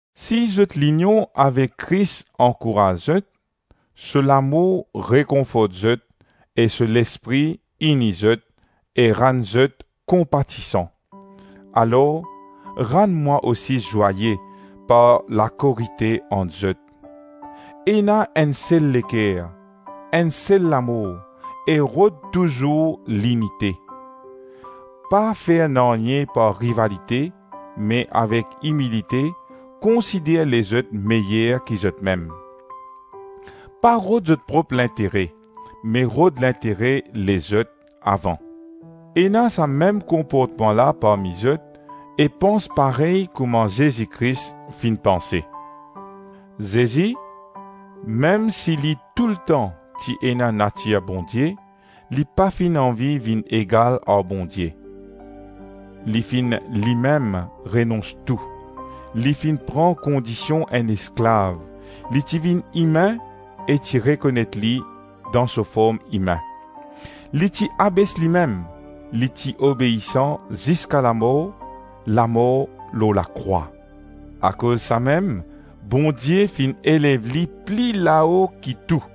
Si zot linion avek Kris ankouraz zot, so lamour rekonfort zot e so Lespri ini zot e rann zot konpatisan, alor rann mwa osi zwaye par lakorite ant zot; ena enn sel leker, enn sel lamour e rod touzour linite. Pa fer nanye par rivalite, me avek imilite, konsider lezot meyer ki zotmem. Pa rod zot prop lintere, me rod lintere lezot avan. Ena sa mem konportman la parmi zot e pans parey kouma Zezi Kris finn panse. Zezi, mem si li toultan ti ena natir Bondie, li pa finn anvi vinn egal ar Bondie. Li finn limem renons tou, li finn pran kondision enn esklav, li ti vinn imin e ti rekonet li dan so form imin. Li ti abes limem, li ti obeisan ziska lamor, lamor lor lakrwa. Akoz samem Bondie finn elev li pli lao ki tou,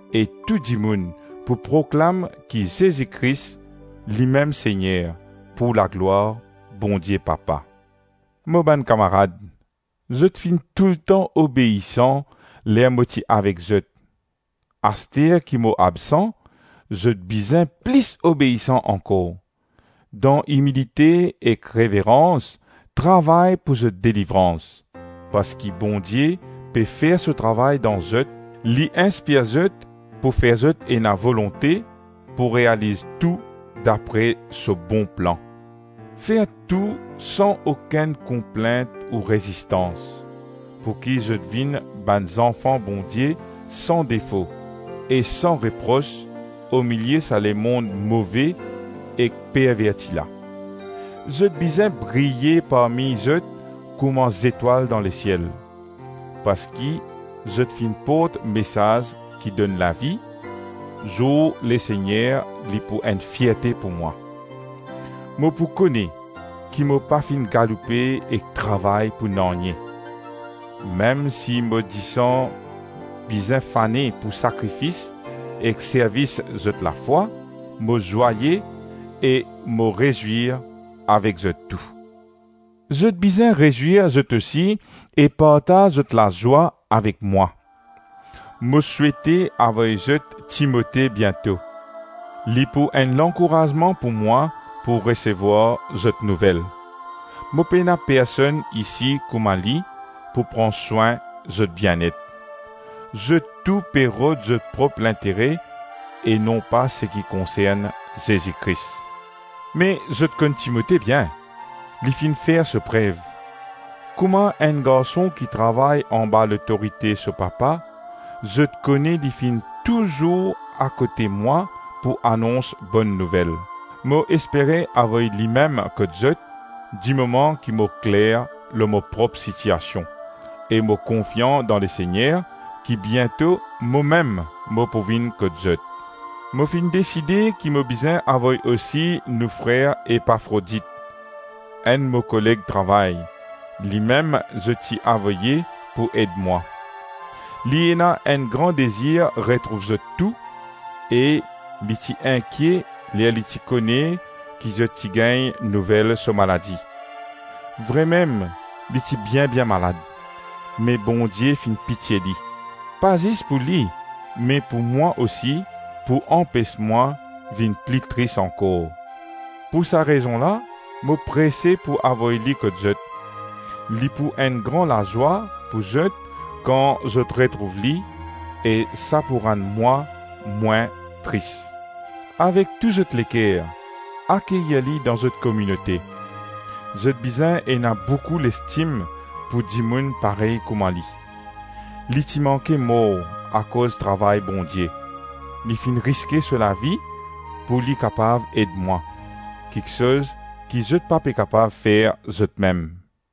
e tou dimoun pou proklam ki Zezi Kris limem Segner, pou laglwar Bondie Papa. Mo bann kamarad, zot finn toultan obeisan ler mo ti avek zot, aster ki mo absan, zot bizin plis obeisan ankor. Dan imilite ek reverans, travay pou zot delivrans, parski Bondie pe fer so travay dan zot, li inspir zot pou fer zot ena volonte pou realiz tou dapre so bon plan. Fer tou san okenn konplint ou rezistans pouki zot vinn bann zanfan Bondie san defo e san repros omilie sa lemonn move ek perverti la. Zot bizin briye parmi zot kouma zetwal dan lesiel. Parski zot finn port mesaz ki donn lavi, zour Lesegner li pou enn fierte pou mwa. Mo pou kone ki mo pa finn galoupe ek travay pou nanye. Mem si mo disan bizin fane pou sakrifis ek servis zot lafwa, mo zwaye e mo rezwir avek zot tou. Zot bizin rezwir zot osi e partaz zot lazwa avek mwa. Mo souete avoy zot Timote biento; li pou enn lankourazman pou mwa pou resevwar zot nouvel. Mo pena personn isi kouma li, pou pran swin zot bienet. Zot tou pe rod zot prop lintere e non pa seki konsern Zezi Kris. Me zot konn Timote bien, li finn fer so prev; kouma enn garson ki travay anba lotorite so papa, zot kone li finn touzour akote mwa pou anons Bonn Nouvel. Mo espere avoy limem kot zot dimoman ki mo kler lor mo prop sitiasion, e mo konfian dan Lesegner ki biento momem mo pou vinn kot zot. Mo finn deside ki mo bizin avoy osi nou frer Epafrodit, enn mo koleg travay, limem zot ti avoye pou ed mwa. Li ena enn gran dezir retrouv zot tou e li ti inkie ler li ti kone ki zot ti gagn nouvel so maladi. Vremem li ti bien-bien malad, me Bondie finn pitie li, pa zis pou li me pou mwa osi, pou anpes mwa vinn pli tris ankor. Pou sa rezon la, mo prese pou avoy li kot zot. Li pou enn gran lazwa pou zot kan zot retrouv li e sa pou rann mwa mwin tris. Avek tou zot leker, akeyir li dan zot kominote. Zot bizin ena boukou lestim pou dimoun parey kouma li. Li ti manke mor akoz travay Bondie. Li finn riske so lavi pou li kapav ed mwa, kiksoz ki zot pa pe kapav fer zotmem.